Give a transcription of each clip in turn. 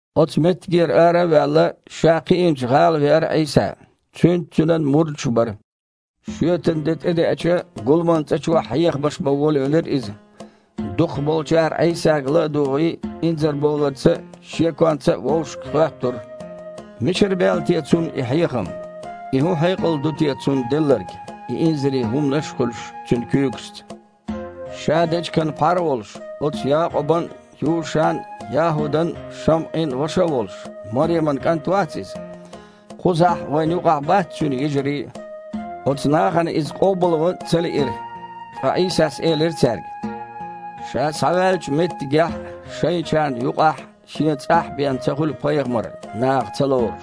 Оцу меттигера ара а ваьлла, Ша кхиинчу гІала веара Іийса. Цуьнца Цуьнан мурдаш а бара. Шоьтан де тІедеача, гуламан цІа чохь хьехамаш бан волавелира Иза. Дукхахболчара Іийсага ла а дугІий, инзарбовларца а, шеконца а вовшашка хоьттура: «Мичахьара баьлла те Цунна и хьехам? И хІун хьекъал ду те Цунна делларг, и инзаре хІуманаш а хуьлуш Цуьнан куьйгашца. Ша дечиган пхьар а волуш, оцу Якъубан а, Юшан а, ЯхІудан а, ШамІин а ваша а волуш, Мареман кІант вац Иза? Кхузахь, вайна юкъахь, бац Цуьнан йижарий а?» Оцу нахана Иза къобалван ца лиира. Ткъа Іийсас элира цаьрга: «Ша схьаваьллачу меттигехь а, шайчарна юкъахь а, шен цІахь а бен ца хуьлу пайхамар наха ца лоруш».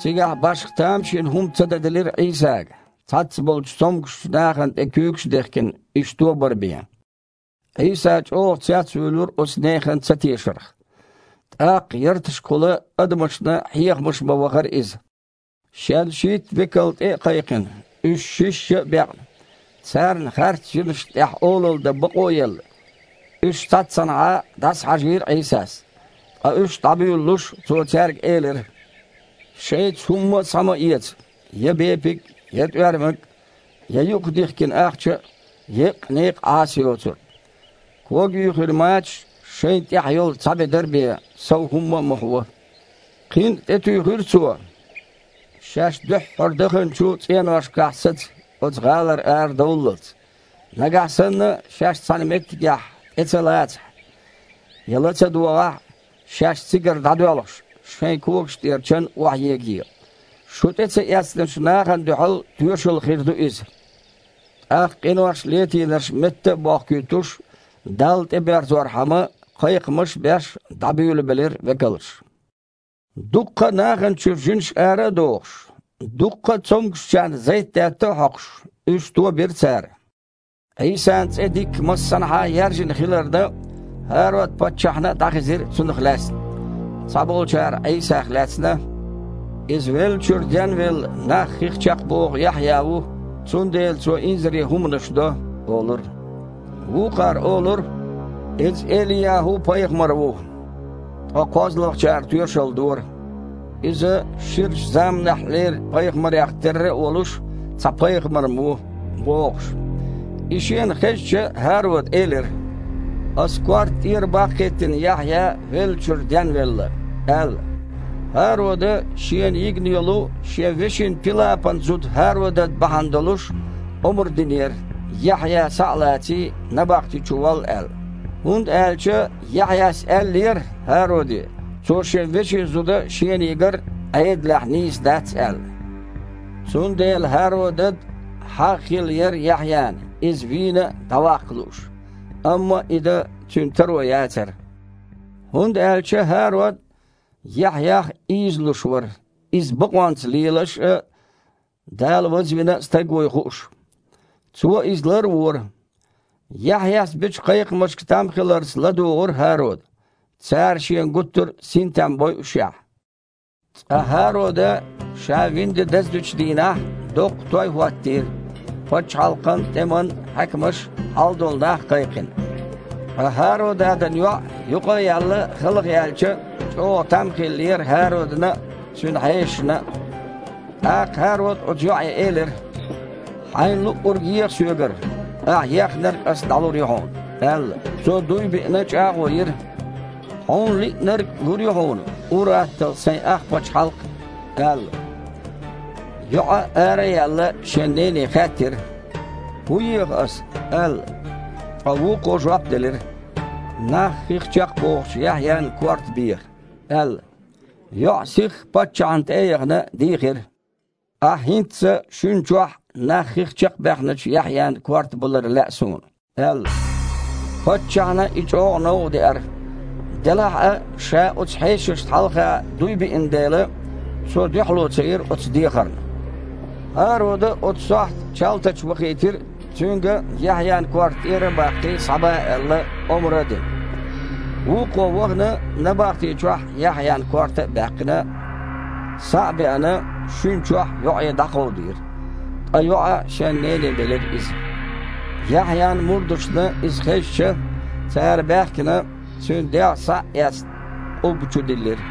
Цигахь башха тамашийна хІума ца даделира Іийсага, цхьаццаболчу цомгушчу нахана тІе куьйгаш а дехкина, уьш тобар бен. Іийса чІогІа цецвуьйлура оцу нехан цатешарх. ТІаккха ярташкахула адамашна хьехамаш бан вахара Иза. Шен шийтта векал тІе а кхайкхина, уьш шишша а бекъна, царна харц жинашна тІехь олалла дан бакъо а елла, уьш цхьаццанхьа дІасахьажийра Іийсас. Ткъа уьш дІабуьйлалуш, Цо цаьрга элира: «Шайца хІумма а схьа ма эца: я бепиг а, я тІоьрмаг а, я юкъах дихкина ахча а, еккъа некъан Іаса йоцург. Кога юьйхина мачаш а, шайна тІехь йолу цхьа бедар а бен, сов хІумма а ма хьуо». Кхин а тІетуьйхира Цо: «Шаьш дуьххьара даханчу цІеношкахь саца, оцу гІалара арадовллалц. Нагахь санна шаьш цхьана меттигехь тІе ца лацахь а, я ла ца догІахь а, шаьш цигара дІадоьлхуш, шайн когаш тІера чан охьаегае. Шу тІе ца эцначу нахана дуьхьал тоьшалла хир ду иза». ТІаккха къинош летийнарш метта а бохкуьйтуш, Далла тІеберзорхьама, кхайкхамаш а беш, дІабуьйлабелира векалш. Дуккха а нахана чуьра жинаш ара а дохуш, дуккха а цомгушчарна зайтдаьтта а хьокхуш, уьш тобира цара. Іийсан цІе дикка массанхьа а яьржина хиларна, ХІарод-паччахьна а дІахезира Цунах лаьцна. Цхьаболчара Іийсах лаьцна: «Иза веллачуьра денвелла нах хих чекхбоху Яхьъя ву, цундела Цо инзаре хІуманаш до», – олура. Вукхара олура: «Иза Эли-ЯхІу-пайхамар ву». Ткъа кхозлагІчара тоьшалла дора: «Иза, ширачу заманахьлера пайхамарех терра а волуш, цхьа пайхамар-м ву», – бохуш. И шена хезча, ХІарода элира: «Аса корта тІера баккхийтина Яхьъя веллачуьра денвелла», – аьлла. ХІарода, шена йигна йолу, шен вешин Пилапан зуда ХІародад бахьана долуш, омра динера, Яхьъя, схьа а лаций, набахти чу волла аьлла. ХІунда аьлча Яхьъяс аьллера ХІароде, цо шен вешин зуда шена йигар Іедалехь нийса дац аьлла. Цундела ХІародад хьагІ хилла яра Яхьъяна, иза вийна а, дІаваккха лууш. Амма и дан цуьнан таро яцара, хІунда аьлча ХІарод Яхьъях ийзалуш вара, иза бакъонца лелаш а, Дала вазвина а стаг вуй хууш. Цо иза лар а вора. Яхьъяс бечу кхайкхамашка там хиларца ладугІура ХІарода, цара шен гуттара а синтем бойушшехь. Цкъа ХІарода ша вина де даздечу дийнахь, доккха той хІоттийра, пачхьалкхан а, тІеман а хьаькамаш а, хьалдолу нах а кхайкхина. Ткъа ХІародадан йоІ, юкъа а яьлла, халха яьлча, чІогІа там хиллера ХІародана а, цуьнан хьешашна а. ТІаккха ХІарода оцу йоІе элира: «Хьайна луъург еха соьгара, ахьа ехнарг аса дІалур ю хьуна», – аьлла. Цо, дуй биъна, чІагІо йира: «Хьуна лиънарг лур ю хьуна, ур-атталла сайн ах пачхьалкх а», – аьлла. ЙоІа, ара а яьлла, шен нене хаьттира: «ХІун еха аса», – аьлла. Ткъа вукхо жоп делира: «Нах хих чекхбохучу Яхьъян корта беха», – аьлла. ЙоІа, сихха паччахьна тІе а яхана, дийхира: «Ахьа хІинцца шуьна чохь нах хих чекхбаьхначу Яхьъян корта балар лаьа суна», – аьлла. Паччахьна и чІогІа новкъадеара, делахь а ша оцу хьешашна хьалха дуй биъна дела, цо дуьхьало ца йира оцу дехарна. ХІарода оцу сохьта чалтач вахийтира, цуьнга, Яхьъян корта тІера а баккхий, схьаба аьлла, омра а дина. Вукхо вахана набахти чохь, Яхьъян корта а баьккхина, схьа а беана, шуьна чохь йоІе дІакховдийра, ткъа йоІа шен нене белира иза. Яхьъян мурдашна иза хезча, цара баьхкина, цуьнан дегІ схьа а эцна, къубба чу диллира.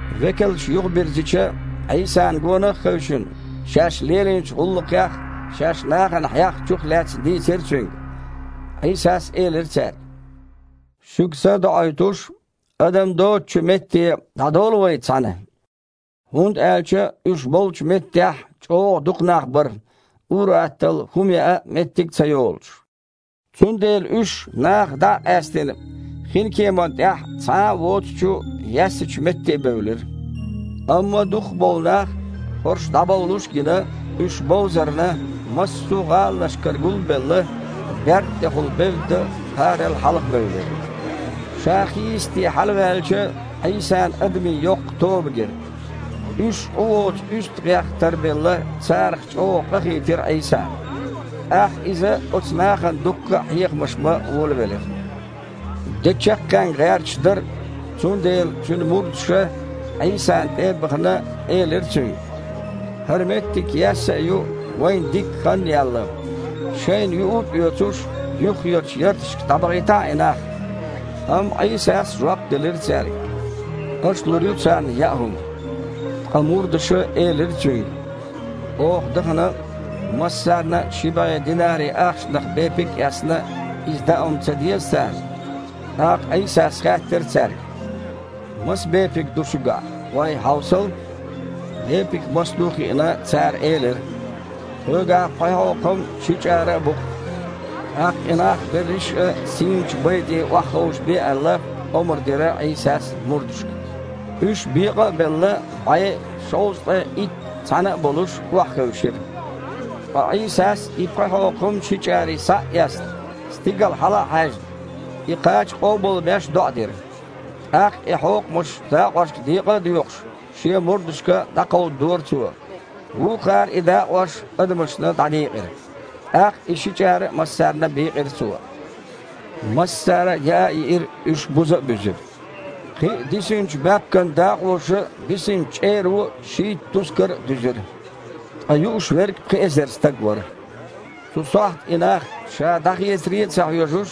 Векалша юхабирзича, Іийсана гонах а хевшина, шаьш лелийначу гІуллакхех а, шаьш нахана хьехначух а лаьцна дийцира Цуьнга. Іийсас элира цаьрга: «Шуьга са а доІуьйтуш, адам доцучу метте дІадовла вай цхьаьна». ХІунда аьлча уьш болчу меттехь чІогІа дукха нах бара, ур-атталла хІума яа а меттиг ца йолуш. Цундела уьш, нахах дІа а къаьстина, хинкеман тІехь цхьа а воцучу яьссачу метте бевлира. Амма дукхахболу нах, хІорш дІабовлуш а гина, уьш бовзарна, массо а гІаланашкара гул а белла, берд тІехула бевдда, кхарал хьалхабевлира. Ша хийисте хьалаваьлча, Іийсана адамийн йоккха тоба гира. Уьш Іу воцу уьстагІех а тарбелла, царах чІогІа къахийтира Іийсана. ТІаккха Иза оцу нахана дуккха а хьехамаш бан волавелира. Де чаккхенга гІерташ дара, цундела Цуьнан мурдаша, Іийсана тІе а бахана, элира Цуьнга: «ХІара меттиг яьсса а ю, вайна дикка хан а яьлла. Шайна юург а оьцуш, юххерчу ярташка дІабахийтахьа и нах». Амма Іийсас жоп делира цаьрга: «Аша лур ю царна яа хІума». Ткъа мурдаша элира Цуьнга: «Оха, дахана, массарна а ши бІе динари ахчанах бепиг а эцна, иза дао-м ца деза царна?» ТІаккха Іийсас хаьттира цаьрга: «Маса бепиг ду шуьгахь? ГІой, хьовсал». Бепиг маса ду а хиъна, цара элира: «Тхоьгахь пхи хьокхам а, ши чІара а бу-кх». ТІаккха, и нах берриш а сийначу бай тІе охьаховшабе аьлла, омра дира Іийсас мурдашка. Уьш, бекъа а белла, бІе а, шовзткъе итт а цхьаьна а болуш, охьахевшира. Ткъа Іийсас и пхи хьокхам, ши чІарий схьа а эцна, стигала хьала а хьаьжна, и кхача къобалбеш, доІа дира. ТІаккха и хьокхамаш дакъошка декъа а доькъуш, Шен мурдашка дІакховдадора Цо. Вукхара и дакъош адамашна дІадийкъира. ТІаккха и ши чІара а массарна бийкъира Цо. Массара а яа а йиира, уьш буза а буьзира. Кхин а дисинчу баьпкан дакъоша а, бисинчу чІеро а шийтта тускар а дуьзира. Ткъа юуш верг пхи эзар стаг вара. Цу сохьта и нах Ша дІахецаре а ца хьоьжуш,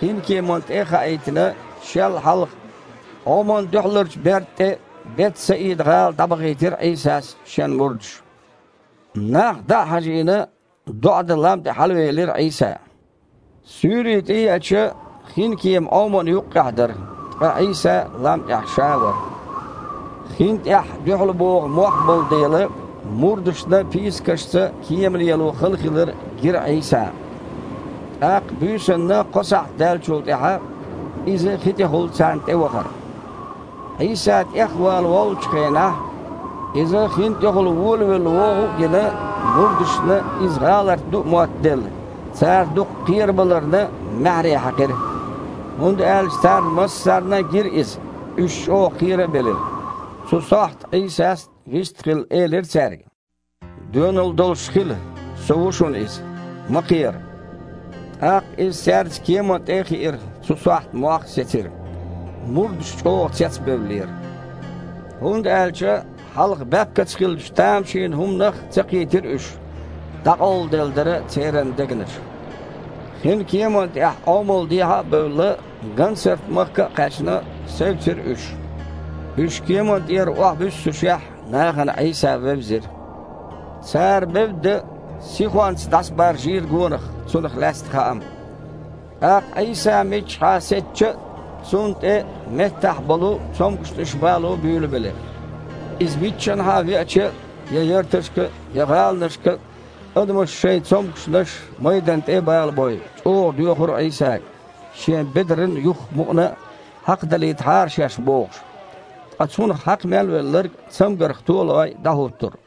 хинкеманна тІе а хаийтина, Шел хьалха, Іоман дуьхьаларчу берда тІе Бет-Саида-гІала дІабахийтира Іийсас Шен мурдаш. Нах дІа а хьажийна, доІа дан лам тІе хьалавелира Іийса. Суьйре тІееача, хинкема Іомана юккъехь дара, ткъа Іийса лам тІехь Ша вара. Хин тІехь дуьхьал богІу мох болу дела, мурдашна пийсакашца кема лело хала хилар гира Іийсана. ТІаккха буьйсанна кхо сахьт даьллачул тІаьхьа Иза хи тІехула царна тІе вахара. Іийса тІехвала воллучу хенахь, Иза хин тІехула волавелла вогІу а гина, мурдашна Иза гІаларт ду а моттаделла, цара дукха кхерабаларна маьхьарий хьаькхира, хІунда аьлча царна массарна а гира Иза, уьш чІогІа кхера а белира. Цу сохьта Іийсас, вист а хилла, элира цаьрга: «Доьналла долуш хила! Со ву шуна иза! Ма кхера!» ТІаккха Иза цаьрца кеман тІе а хиира, цу сохьта мох а сецира. Мурдаш чІогІа цецбевллера, хІунда аьлча хьалха баьпкаца хиллачу тамашийна хІуманах а ца кхийтира уьш, дІакъовладелла дара церан дегнаш. Хин кеман тІехь Іомал дехьа а бевлла, Гансарт-махка а кхаьчна, севцира уьш. Уьш кеман тІера охьабуьссушехь, нахана Іийса вевзира. Цара, бевдда, сихонца дІасабаржийра гонах Цунах лаьцна хаам. ТІаккха Іийса миччахьа сецча а, Цунна тІе меттахь болу цомгушнаш бало буьйлабелира. Иза миччанхьа веача а, я ярташка а, я гІаланашка а, адамаша шайн цомгушнаш майданна тІе а балабой, чІогІа доьхура Іийсага, Шен бедаран юьхах мукъана а хьакхадалийтахьара шаьш бохуш. Ткъа Цунах хьакха мел велларг, цамгарх то а лой, дІахІуттура.